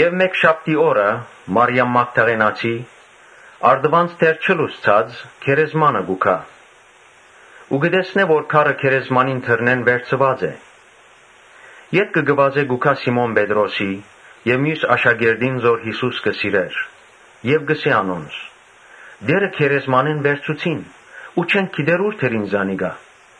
Մէկշաբթի օրը Մարիամ Մագդաղենացին առտուն՝ դեռ չլուսցած՝ գերեզման կ’երթայ ու կը տեսնէ որ քարը գերեզմանին դռնէն վերցուած է։ Անմիջապէս կը վազէ կ’երթայ Սիմոն Պետրոսին եւ միւս աշակերտին, որ Յիսուսը կը սիրէր եւ կ’ըսէ անոնց. «Տէրը գերեզմանէն վերցուցին ու չենք գիտեր ո՞ւր դրին զանիկա»։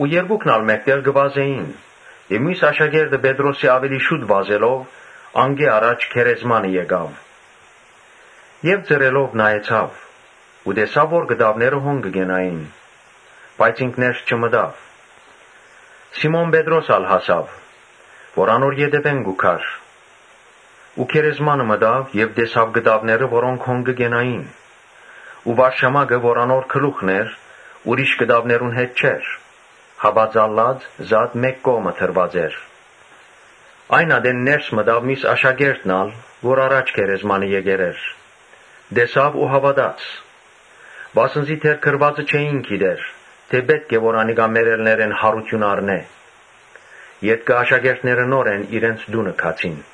Երկուքն ալ մէկտեղ կը վազէին եւ միւս աշակերտը Պետրոսէն աւելի շուտ վազելով՝ անկէ առաջ գերեզմանը հասաւ Եւ ծռելով նայեցաւ ու տեսաւ որ կտաւները հոն կը կենային. բայց ինք ներս չմտաւ։ Սիմոն Պետրոս ալ հասաւ, որ անոր ետեւէն կու գար ու գերեզմանը մտաւ եւ տեսաւ կտաւները, որոնք հոն կը կենային Ու վարշամակը, որ անոր գլուխն էր՝ միւս կտաւներուն հետ չէր, հապա ծալուած մէկ կողմը դրուած էր։ Այն ատեն ներս մտաւ միւս աշակերտն ալ, որ առաջ գերեզմանը եկեր էր, տեսաւ ու հաւատաց։ Վասն զի դեռ գրուածը չէին գիտեր, թէ ‘Պէտք է որ անիկա մեռելներէն յարութիւն առնէ’։ Ետքը աշակերտները նորէն իրենց տունը գացին։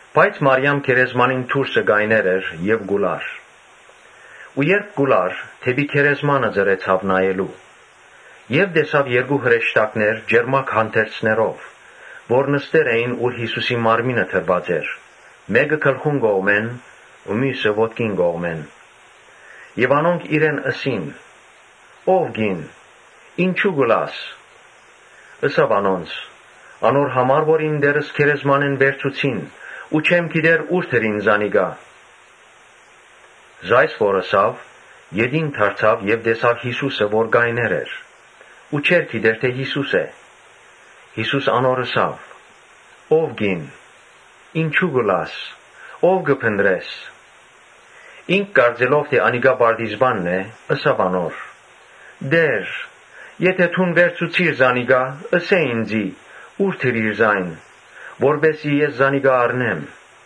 Բայց Մարիամ գերեզմանին դուրսը կայներ էր եւ կու լար ու երբ կու լար՝ դէպի գերեզմանը ծռեցաւ նայելու։ Տեսաւ երկու հրեշտակներ ճերմակ հանդերձներով, որ նստեր էին, ուր Յիսուսի մարմինը դրուած էր, մէկը գլխուն կողմը ու միւսը ոտքին կողմը։ Անոնք իրեն ըսին. «Ո՛վ կին, ինչո՞ւ կու լաս»։ Ըսաւ անոնց. «Անոր համար, որ իմ Տէրս գերեզմանէն վերցուցին ու չեմ գիտեր ո՞ւր դրին զանիկա»։ Երբ ասիկա ըսաւ՝ ետին դարձաւ եւ տեսաւ Յիսուսը, որ կայներ էր ու չէր գիտեր թէ Յիսուսն է։ Յիսուս անոր ըսաւ. «Ո՛վ կին, ինչո՞ւ կու լաս, ո՞վ կը փնտռես»։ Ինք կարծելով թէ անիկա պարտիզպանն է, ըսաւ անոր. «Տէ՛ր, եթէ դուն վերցուցիր զանիկա, ըսէ՛ ինծի, ո՞ւր դրիր զայն, որպէս զի ես զանիկա առնեմ»։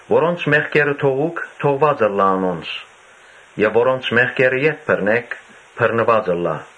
Որոնց մեղքերը որ թողուք, թողուած ըլլայ անոնց եւ որոնց մեղքերը որ ետ բռնէք, բռնուած ըլլայ»։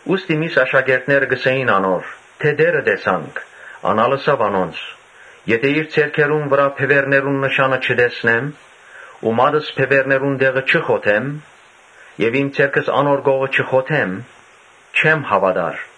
Երբ միւս աշակերտները ըսին անոր թէ Տէրը տեսանք, ան ալ ըսաւ անոնց. «Եթէ իր ձեռքերուն վրայ բեւեռներուն նշանը չտեսնեմ ու մատս բեւեռներուն տեղը չխոթեմ եւ իմ ձեռքս անոր կողը չխոթեմ՝ չեմ հաւատար»։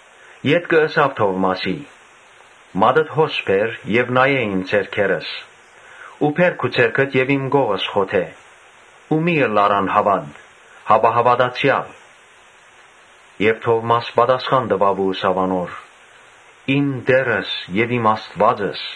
Ետքը ըսաւ Թովմասին. «Մատդ հո՛ս բեր եւ նայէ՛ իմ ձեռքերուս ու բե՛ր քու ձեռքդ ու իմ կողս խոթէ ու մի՛ ըլլար անհաւատ, հապա հաւատացեալ»։ Եւ Թովմաս պատասխան տուաւ ու ըսաւ անոր. «Իմ Տէրս եւ իմ Աստուածս»։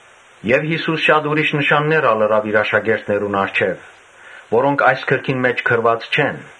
Յիսուս շատ ուրիշ նշաններ ալ ըրաւ իր աշակերտներուն առջեւ, որոնք այս գրքին մէջ գրուած չեն։